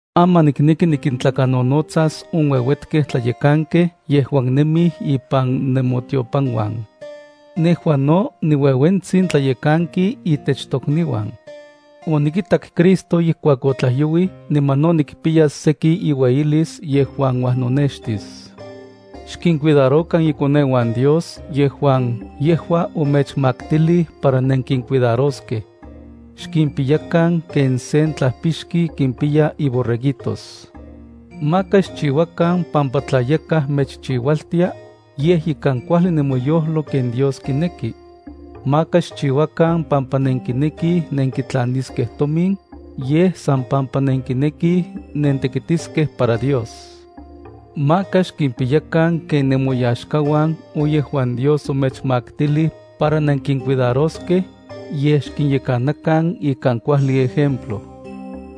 Aman nikneki nikintlakanonotsas on ueuetkej tlayekankej yejuan nemij ipan nemotiopanuan. Nejua no niueuetsin tlayekanki itech tokniuan. Onikitak Cristo ijkuak otlajyouij niman no nikpiyas seki iueyilis yejuan uajnonextis. Xkincuidarokan ikoneuan Dios yejuan yejua omechmaktilij para nenkincuidaroskej. Xkimpiyakan ken sen tlajpixki kimpiya iborreguitos. Maka xchiuakan pampa tla yakaj mechchiualtia, yej ikan kuajli nemoyojlo ken Dios kineki. Maka xchiuakan pampa nenkinekij nenkitlaniskej tomin, yej san pampa nenkinekij nentekitiskej para Dios. Maka xkimpiyakan ken nemoyaxkauan on yejuan Dios omechmaktilij para nenkincuidaroskej, yej xkinyekanakan ikan kuajli ejemplo.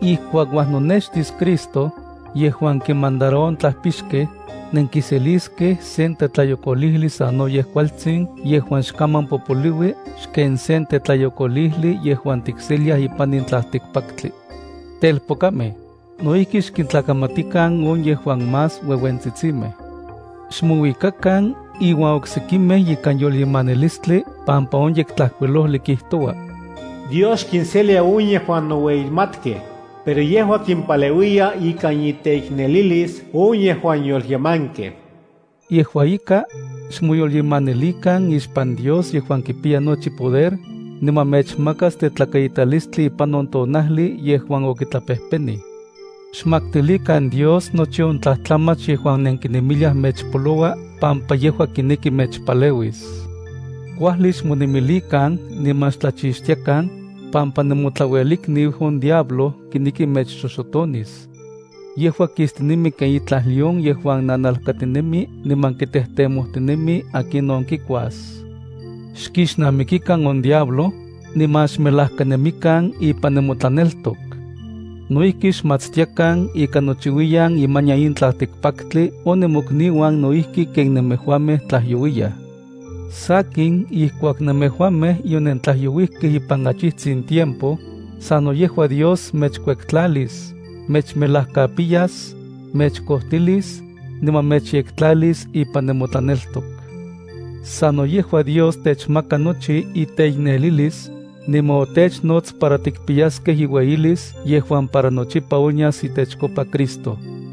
Ijkuak uajnonextis Cristo, yejuan kinmandaroua on tlajpixkej, nenkiseliskej sen tetlayokolijli sanoyej kualtsin yejuan xkaman popoliui xken sen tetlayokolijli yejuan tikseliaj ipan in tlaltikpaktli. Telpokamej, no ijki xkintlakamatikan on yejuan más ueuentsitsimej. Xmouikakan iuan oksekimej ikan yolyemanilistli pampa on Yektlajkuilojli kijtoua: Dios xkinselia on yejuan noueyimatkej, pero yejua kimpaleuiya ikan iteiknelilis on yejuan yolyemankej. Yejua ika, xmoyolyemanilikan ixpan Dios yejuan kipiya nochi poder, niman mechmakas tetlakaitalistli ipan on tonajli yejuan okitlapejpenij. Xmaktilikan Dios nochi on tlajtlamach yejuan mechyolpajsolou pampa yejua kineki mechpaleuis. Kuajli xmonemilikan niman xtlachixtiakan, pampa nemotlauelikniu on diablo kineki mechxoxotonis. Yejua kistinemi ken itlaj león yejuan nanalkatinemi niman kitejtemojtinemi akinon kikuas. Kixnamikikan on diablo, niman xmelajkanemikan ipan nemotlaneltok. No ijki xmatstiakan ika nochiuiyan imanian in tlaltikpaktli on nemokniuan no ijki ken nemejuamej tlajyouiyaj. Sakin ijkuak nemejuamej yonentlajyouijkej ipan achijtsin tiempo, sano yejua Dios mechkueltlalis, mechmelajkapiyas, mechkojtilis, niman mechyektlalis ipan nemotlaneltok. Sano yejua Dios techmaka nochi iteiknelilis, niman otechnots para tikpiyaskej iueyilis yejuan para nochipa onyas itechkopa Cristo.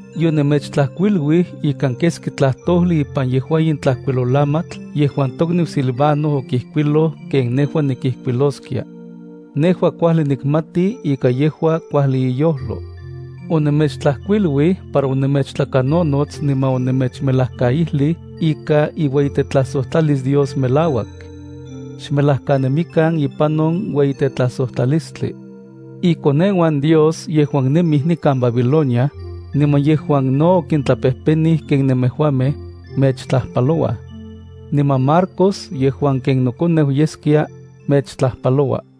Yonemechtlajkuiluij ikan keski tlajtojli ipan yejua in tlajkuilolamatl yejuan tokniu Silvano okijkuiloj ken nejua nikijkuiloskia. Nejua kuajli nikmati ika yejua kuajli iyojlo. Onemechtlajkuiluij para onemechtlakanonots niman onemechmejlakaijlij ika iueyitetlajsojtlalis Dios melauak. Xmelajkanemikan ipan on ueyitetlajsojtlalistli. Ikoneuan Dios yejuan nemij nikan Babilonia, niman yejuan no okintlapejpenij ken nemejuamej, mechtlajpalouaj. Niman Marcos yejuan ken nokoneu yeskia, mechtlajpaloua.